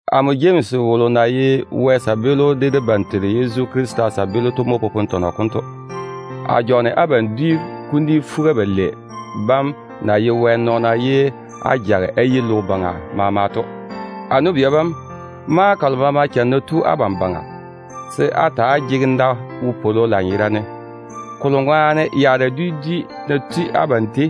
Amo Jemsi wolo na ye Wɛ kabaa de debam Teiru Yezu Krista kabaa to mo popone tɔnɔ konto. A jɔɔne abam dwi kuni fuga-balei bam na ye Wɛ nɔɔna ye á jage á yi logo baŋa jei maama to. A nu-bia bam, maŋa kalo maama cham ná tu abam baŋa, se á ta‑á jege wopwolo lanyerane, kolo ŋwaane á yei we yaara dwi dwi ná tui abam tei,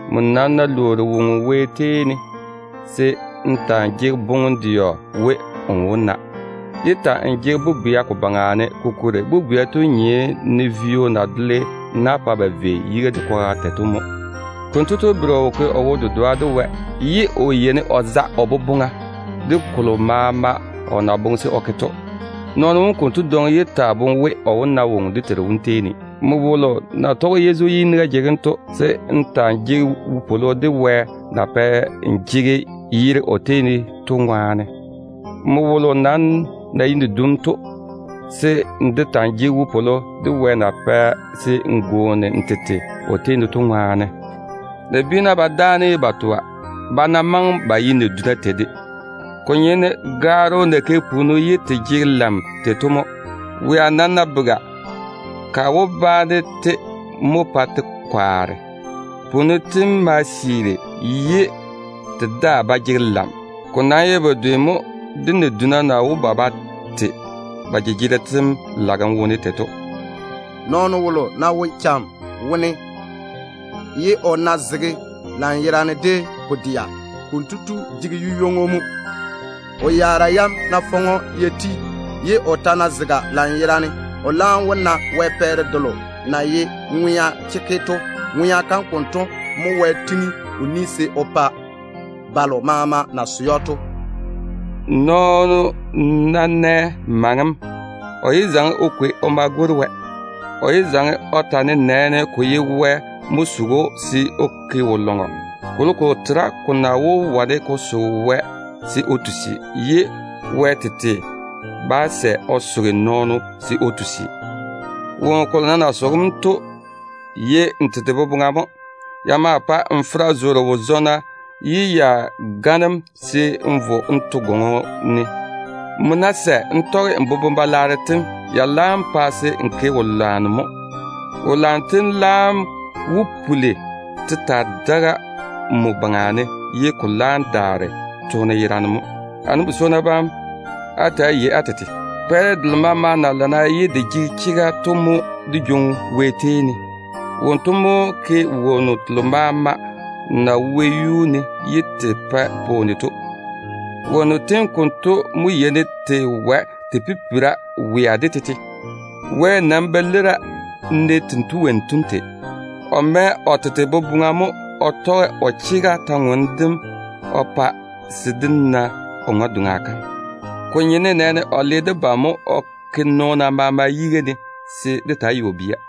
Nmo nam ná lwoori woŋo Wɛ tei ne, se n ta‑n jege boŋem-dɛɔ we, n wó seene n na. Yé ta‑n jege bobwea ko baŋa ne, kokuri bobwea tu nye ne vio na dole na-ŋone, pa se vei yiga de kwaga tei to mo. Konto tu bere o wo ke o wo-dedoa de Wɛ, ye o yeini o za o boboŋa de kolo maama o na boŋe se o ke to. Nɔɔno wom konto dwoŋi yé taa boŋe we, o wó na woŋo dé Teiru wom tei ne. Nmo wolo na tɔge Yezu ye yiniga jege‑m to, se n ta‑n jege wopwolo de Wɛ na pɛ n jege yere o tei ne to ŋwaane. Nmo wolo nam na ye nadum to, se n de ta‑n jege wopwolo de Wɛ na pɛ se n gwooni n tete o tei ne to ŋwaane. Nabiina ba dáana ye ba toa, ba ná maŋe ba ye naduna tei de. Ko nye ne gaaro na ke punnu ye te jege lam tei to mo. Wea nam ná bega, ka wó baane-te mo pa te kwaare. Punnu tem ma siiri ye te daa ba jege lam. Ko nam ye bedwe mo de naduna na wó ba ba te ba jejegero tem lagem wone tei to. Nɔɔno wolo ná wo cham wone ye o ná zege lanyerane de pu-dɛa, konto tu jege yu-ywoŋo mo. O yaara yam ná faŋe‑o ya ti, ye o ta ná zege lanyerane, o laam wó na Wɛ pɛɛre delo na ye ŋwea chekke to. Wɛ pwooli se o pa ŋwea kam konto mo balo maama na swoi‑o to. Nɔɔno ná nɛ maŋem, o yé zaŋe o kwei o ma gwori Wɛ. O yé zaŋe o ta nenɛɛne, ko ye Wɛ mo soge‑o se o ke wo-lɔŋɔ. Kolokolo tera ko na wó wane ko soge Wɛ se o tusi, ye Wɛ tete bá sɛ se o soge nɔɔno se o tusi. Woŋo kolo nam na yeini ko soge‑m to ye n tete boboŋa mo. Ya maa pae n fera zoore wo-zɔɔna, ye ya gane‑m se n vo n to gwoŋo ne. Nmo ná sɛ n tɔge n boboŋ-balwaaro tem, ya laam pa se n ke wo-lwanno mo. Wo-lwanno tem laam wó puli te taa daga nmo baŋa ne, ye ko laam daare toone yerane mo. A nu-bi-swonnu bam, ta‑á yei-na á tete. Pɛɛre delo maama na lana ye de jege chega to mo dé yeini dé jwoŋi Wɛ tei ne. Wonto mo ke wonnu telo maama na wo wɛyuu ne ye te pae pwooni to. Wonnu tem konto mo yeini te wae te pipira wea de tete. Wɛ nam ba leira ne tento wonnu tem tei. O boboŋa jaane mo se o tɔge o chega taane dem ŋwaane o pa dé na o ŋwe-doŋa kam. Ko nye nenɛɛne o le debam mo o ke nɔɔna maama yiga ne se dé taa ye o bia.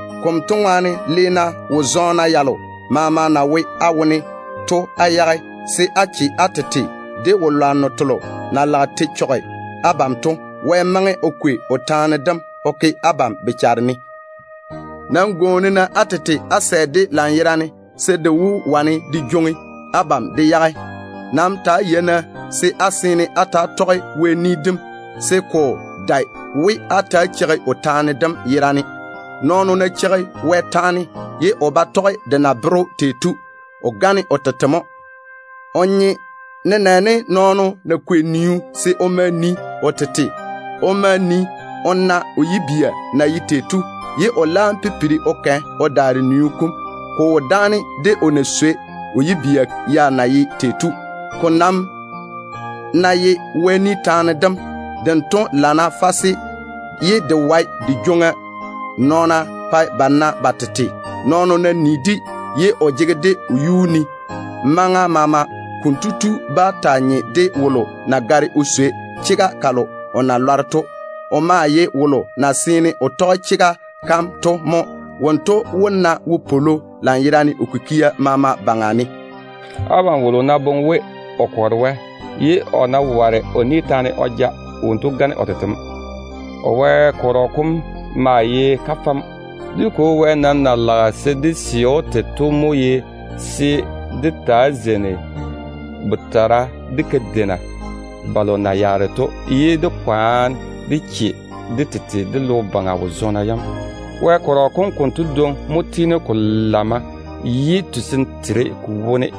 Konto ŋwaane, le-na wo-zɔɔna yalo maama na wo á wone to á yage, se á daare á che á tete de wo-lwanno telo na lage te chɔge abam to. Wɛ maŋe o kwei o taane dem o ke abam bochara ne. Nam gwooni-na á tete á sɛ-de lanyerane, de na wó wane de jwoŋi abam de yage to ŋwaane. Nam ta‑á yei-na se á ta‑á tɔge Wɛ kwora kam, se ko dae we á ta‑á cheigi o taane dem yerane. Nɔɔno wolo ná cheigi Wɛ taane ye o ba tɔge de na bere tei to, kotu gane o tete mo. O nye nenɛɛne nɔɔno mo kwei niu se o ma o nii o tete. O ma nii o na o yibia na ye tei to, ye o laam pipiri o kɛ o daare niu kom. Ko wo dáane de o na swei o yibia kam na ye tei to. Ko nam ná ye Wɛ ni taane dem, dento lana fase ye de wae de jwoŋi nɔɔna pa ba na ba tete. Nɔɔno ná nii-de ye o jege-de o yuu ne maŋa maama, konto tu bá taa nye de wolo na gare o swei chega kalo o na lɔre to. O maa ye wolo na seene o tɔge chega kam to mo. Wonto wó na wopwolo lanyerane o kikia maama baŋa ne. Abam wolo ná boŋe we o kɔre Wɛ, ye o ná ware o ni taane o ja, wonto gane o tete mo. O Wɛ kɔrɔ kom maa ye kafɛ mo. Dé Kwo Wɛ nam na lage se dé sɛ‑o tei to mo ye se dé taa zeini botara de kadeina balo na yaare to, ye dé kwaane dé che dé tete de logo baŋa wo-zɔɔna yam. Wɛ kɔrɔ konto dwoŋi mo su Wɛ yi, ye tusim tere ko wone.